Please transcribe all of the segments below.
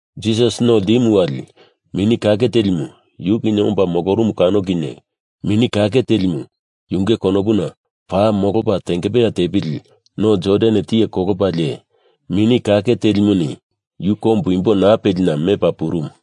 Jisas no ltimu wali Mini Kake Telimu yu kinye omba molorumu kano kinye Mini Kake Telimu yunge konopuna paa molopa tengepeya tepili No Jordan tiye kolopalie, Mini Kake Telimuni yu kombu imbo naa pelina mepa purumu.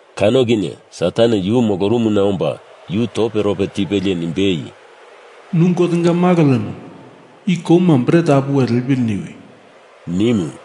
Kano kinye Satan yu molorumuna omba yu toperope tipelie nimbei, “Nu Gotenga Malo lemo i kouma bret apuwe lepili niwi,” nimu.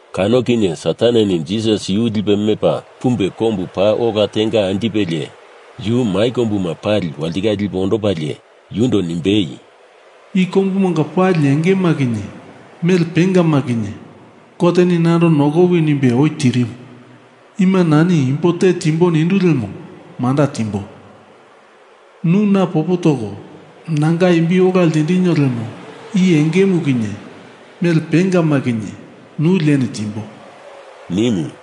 Kano kinye Sataneni Jisas yu lipe mepa pumbe kombu paa ola tenga anjipelie, yu mai kombuma pali walitikale lipe ondopalie, yundo nimbei, “I kombumanga pali engema kinye mele pengama kinye Goteni nando nokowi nimbe oi tirimu. Ima nani imbo te timbo nindu lemo manda timbo. Nu na popo toko nanga imbi ola ltindinio lemo i engemu kinye mele pengama kinye nu lieni timbo,” nimu.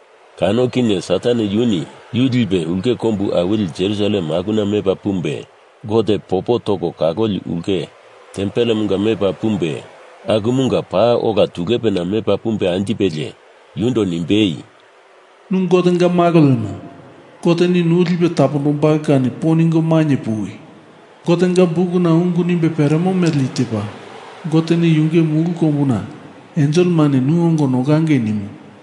Kano kinye Satan yuni yu lipe ulke kombu awili Jerusalem akuna mepa pumbe, Gote popo toko kaloli ulke tempelemunga mepa pumbe, akumunga paa ola tulepena mepa pumbe anjipelie, yundo nimbei, “Nu Gotenga Malo lemo Goteni nu lipe tapondombalo kani po ningo mainye puwi! Gotenga Bukuna ungu nimbe peremo mele i tepa: Goteni yunge mulu kombuna enselemani nu ongo nokangei nimo.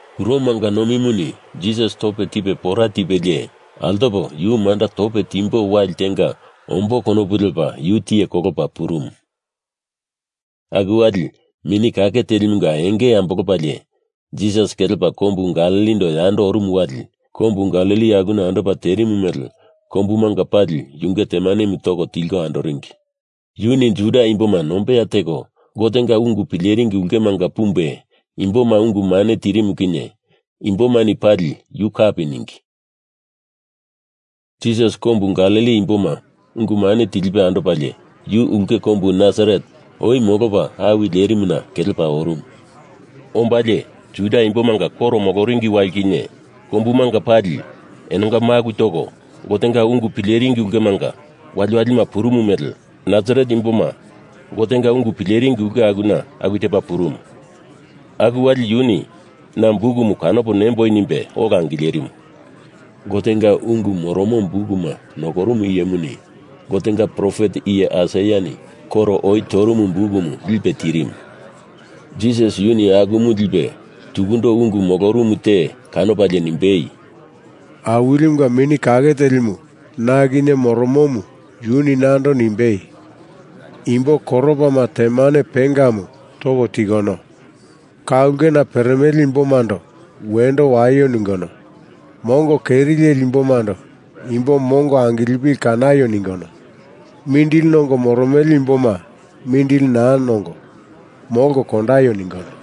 Kuromanga nomimuni Jisas tope tipe pora tipelie, altopo yu manda tope timbo wali tenga ombo konopu lepa yu tiye kolopa purumu. Aku wali Mini Kake Telimunga enge ambolopalie Jisas kelepa kombu Galilindo yando orumu wali Kombu Galili akuna andopa terimu mele kombumanga pali yunge temanemu toko tilko andoringi. Yuni Juda Imboma nombeya teko Gotenga ungu pileringi ulkemanga pumbe imboma ungu mane tirimu kinye imbomani pali yu kapi ningi. Jisas kombu Galili Imboma ungu mane tilipe andopalie, yu ulke kombu Nasaret oi molopa awi lerimuna kelepa orumu. Ombalie Juda Imbomanga koro moloringi wali kinye kombumanga pali enonga maku toko Gotenga ungu pileringi ulkemanga waliwali purumu mele Nasaret imboma Gotenga ungu pileringi ulke akuna aku tepa purumu. Aku wali yuni na bukumu kanopo nemboi nimbe ola angilerimu. Gotenga ungu moromo bukuma nokorumu iyemuni Gotenga profet iye Aisaiani koro oi torumu bukumu lipe tirimu. Jisas yuni akumu lipe tukundo ungu molorumu te kanopalie nimbei, “Awilimunga Mini Kake Telimu na kinye moromomu yuni nando nimbei, Imbo koropama temane pengamu toko tikono, ka ulkena peremele imbomando wendo waio ningono, mongo keri leli imbomando imbo mongo angilipili kanaio ningono, mindili nongo moromele imboma mindili naa nongo, molko kondaio ningono,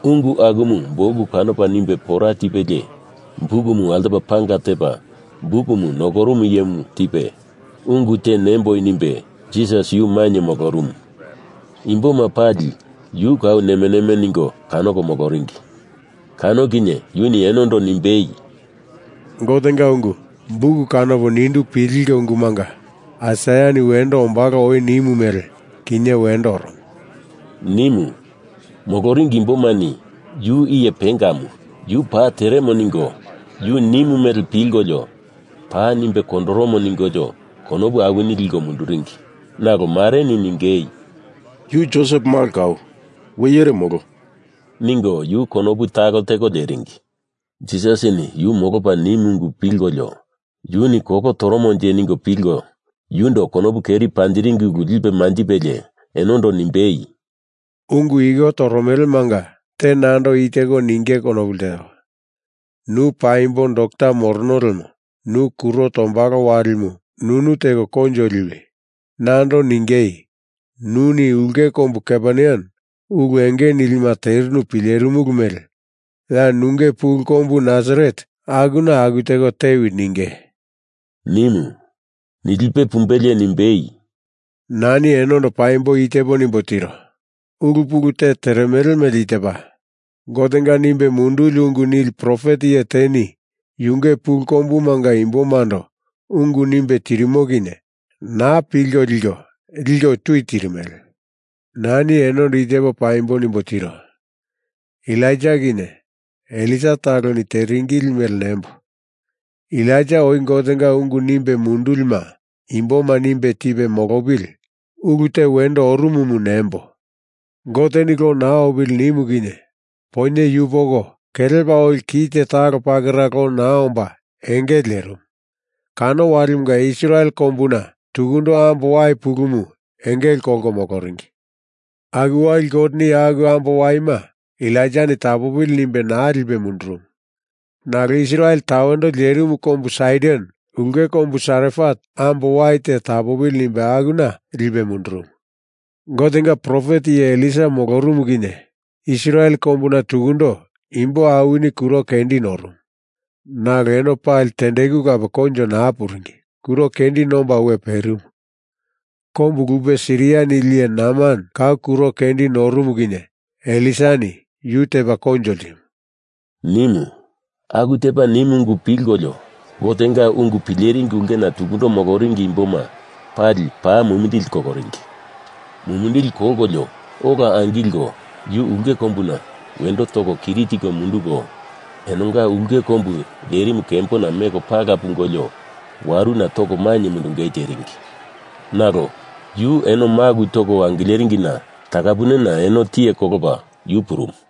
Ungu akumu buk kanopa nimbe pora tipelie bukumu altopa panga tepa bukumu nokorumu iyemu tipe, ungu te nemboi nimbe Jisas yu mainye molorumu. Imboma pali yu kau neme neme ningo kanoko moloringi. Kano kinye yuni enondo nimbei, “Gotenga ungu buk kanopo nindu pilinge ungumunga Aisaiani wendo ombalo oi nimu mele, kinye wendo oromo,” nimu. Moloringi imbomani yu iye pengamu, yu paa teremo ningo yu nimu mele pilkolio paa nimbe kondoromo ningolio konopu awini liko munduringi. Nalo mareni ningei, “Yu Josep malo kau, we iyere molo,” ningo yu konopu talo teko leringi. Jisasini yu molopa nimu ungu pilkolio yuni kolo toromonje ningo pilko yundo konopu keri panjiringi ulu lipe manjipelie enondo nimbei, “Ungu iko toromelemanga te nando i teko ningei konopu lteo. Nu paimbo dokta morono lemo nu kuro tombalo walimu nunu teko koinjo liwi. Nando ningei, Nuni ulke kombu Kaperneam ulu enge nilima terinu pilerimulu mele ya nunge pulu kombu Nasaret akuna aku teko tewi ninge,” nimu. Nilipe pumbelie nimbei, “Nani enondo paimbo i tepo nimbo tiro. Ulu pulu te teremele mele i tepa: Gotenga nimbe munduli ungu nili profet iye teni yunge pulu kombumanga imbomando ungu nimbe tirimo kinye naa pilko liko liko tui tirimele. Nani enondo i tepo paimbo nimbo tiro. Elaija kinye Elisa taloni teringili mele nembo! Elaija oi Gotenga ungu nimbe mundulima imboma nimbe tipe molopili ulu te wendo orumumu nembo! Goteni lo naa opili nimu kinye poinye yupoko kelepa oli kite talo pakera lo naa omba engele lerimu. Kano walimunga Israel kombuna tukundo ambo wai pulumu engele kolko moloringi. Aku wali Goteni aku ambo waima Elaijani tapopili nimbe naa lipe mundurumu. Nalo Israel tawendo lerimu kombu Saidon ulke kombu Sarefat ambo wai te tapopili nimbe akuna lipe mundurumu. Gotenga profet iye Elisa molorumu kinye Israel kombuna tukundo imbo awini kuro kendi norumu, nalo eno pali tendeku kape koinjo naa puringi, kuro kendi nomba we perimu. Kombu lupe Siria nili iye Naman kau kuro kendi norumu kinye Elisani yu tepa koinjo ltimu,” nimu. Aku tepa nimu ungu pilkolio Gotenga ungu pileringi ulkena tukundo moloringi imboma pali paa mumindili koloringi. Mumindili kolkolio ola angilko yu ulke kombuna wendo toko kiri tiko munduko, enonga ulke kombu lerimu kembona meko pala pungolio waruna toko mainye mundungei teringi. Nalo yu eno maku toko angileringina takapunena eno tiye kolopa yu purumu.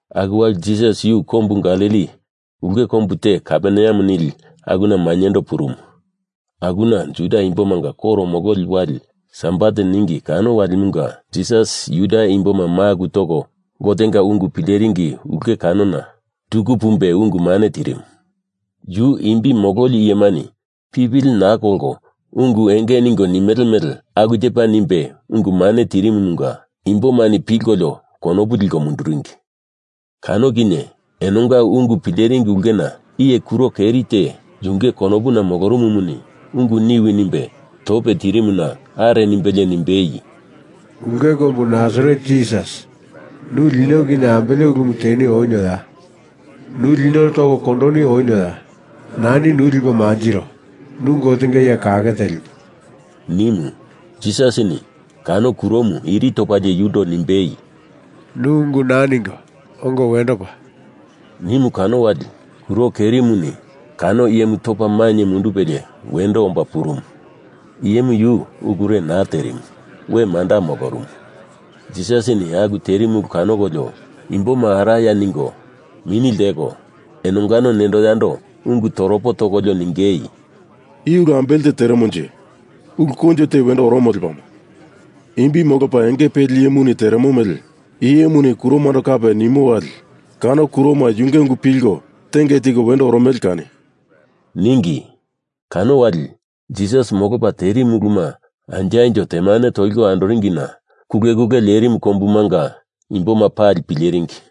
Aku wali Jisas yu kombu Galili ulke kombu te Kaperneam nili akuna mainyendo purumu. Akuna Juda Imbomanga koro mololi wali sabat ningi kano walimunga Jisas Juda Imboma maku toko Gotenga ungu pileringi ulke kanona tuku pumbe ungu mane tirimu. Yu imbi mololi iyemani pipili naa kolko ungu enge ningo nimele mele aku tepa nimbe ungu mane tirimumunga imbomani pilkolio konopu liko munduringi. Kano kinye enonga ungu pileringi ulkena iye kuro keri te yunge konopuna molorumumuni ungu niwi nimbe tope tirimuna are nimbelie nimbei, “Ulke kombu Nasaret Jisas, nu lino kinye ambele ulumu teni onioya? Nu lino toko kondoni onioya? Nani nu lipo manjiro. Nu Gotenga Iye Kake Telimu,” nimu. Jisasini kano kuromu iri topalie yundo nimbei, “Nu ungu naa ningo ongo wendo pa,” nimu kano wali kuro kerimuni kano iyemu topa mainye mundupelie wendo omba purumu. Iyemu yu ulure naa terimu, we manda molorumu. Jisasini aku terimu ulu kanokolio imboma araya ningo, mini lteko, enongano nendo yando ungu toropo tokolio ningei, “I ulu ambele te teremonje? Ulu koinjo te wendo oromo lepamo. Imbi molopa enge peli iyemuni teremo mele i iyemuni kuromando kape nimo wali kano kuroma yunge ungu pilko tenge tiko wendo oromele kani,” ningi. Kano wali, Jisas molopa terimu uluma anjo anjo temane toliko andoringina kule kule lerimu kombumanga imboma pali pileringi.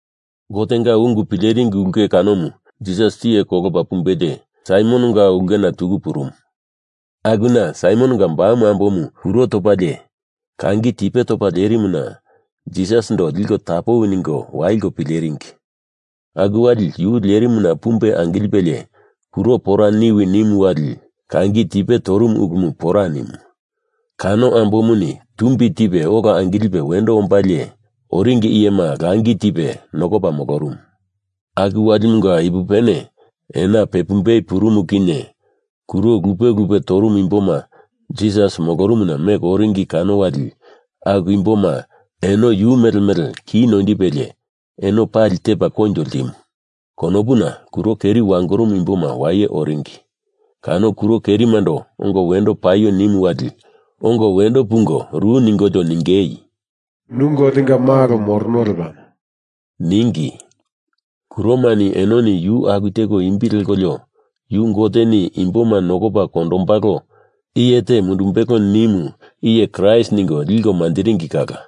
Gotenga ungu pileringi ulke kanomu Jisas tiye kolopa pumbelie, Saimononga ulkena tuku purumu. Akuna Saimononga bamu ambomu kuro topalie kangi tipe topa lerimuna Jisasindo liko tapowi ningo waliko pileringi. Aku wali yu lerimuna pumbe angilipelie kuro pora niwi nimu wali kangi tipe torumu ulumu pora nimu. Kano ambomuni tumbi tipe ola angilipe wendo ombalie, oringi iyema langi tipe nokopa molorumu. Aku walimunga ipupene, ena pepumbei purumu kinye, kuro lupe lupe torumu imboma Jisas molorumuna meko oringi kano wali aku imboma eno yu mele mele kini noindipelie eno pali tepa koinjo ltimu. Konopuna kuro keri wangorumu imboma waye oringi. Kano kuro kerimando ongo wendo paio nimu wali ongo wendo pungo ru ningolio ningei, “Nu Gotenga Malo morono lepamo,” ningi. Kuroma enoni yu aku teko imbi lekolio yu Goteni Imboma nokopa kondombalo iye te mundumbelo nimu iye Kraist ningo liko manjiringi kala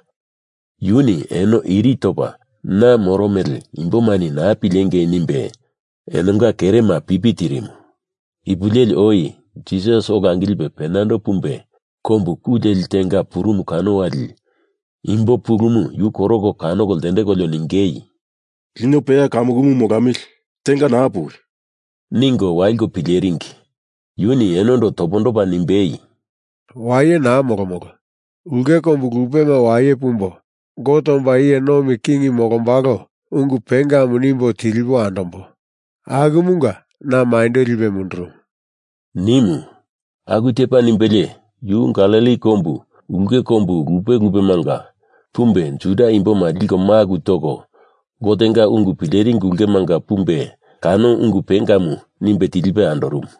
yuni eno iri topa na moro mele imbomani naa pilengei nimbe enonga kerema pipi tirimu. Ipu leli oi Jisas ola angilipe penando pumbe kombu ku leli tenga purumu kano wali imbo pulumu yu koroko kanoko ltendekolio ningei, “Lino peya kamukumu molamili! Tenga naa puwi,” ningo waliko pileringi. Yuni enondo topondopa nimbei, “Waye naa molomolo. Ulke kombu lupema waye pumbo Gote omba iye nomi king molombalo ungu pengamu nimbo tilipo andombo. Akumunga na maindo lipe mundurumu,” nimu. Aku tepa nimbelie yu Galili kombu ulke kombu lupe lupemanga pumbe Juda imboma liko maku toko Gotenga ungu pileringi ulkemanga pumbe kano ungu pengamu nimbe tilipe andorumu.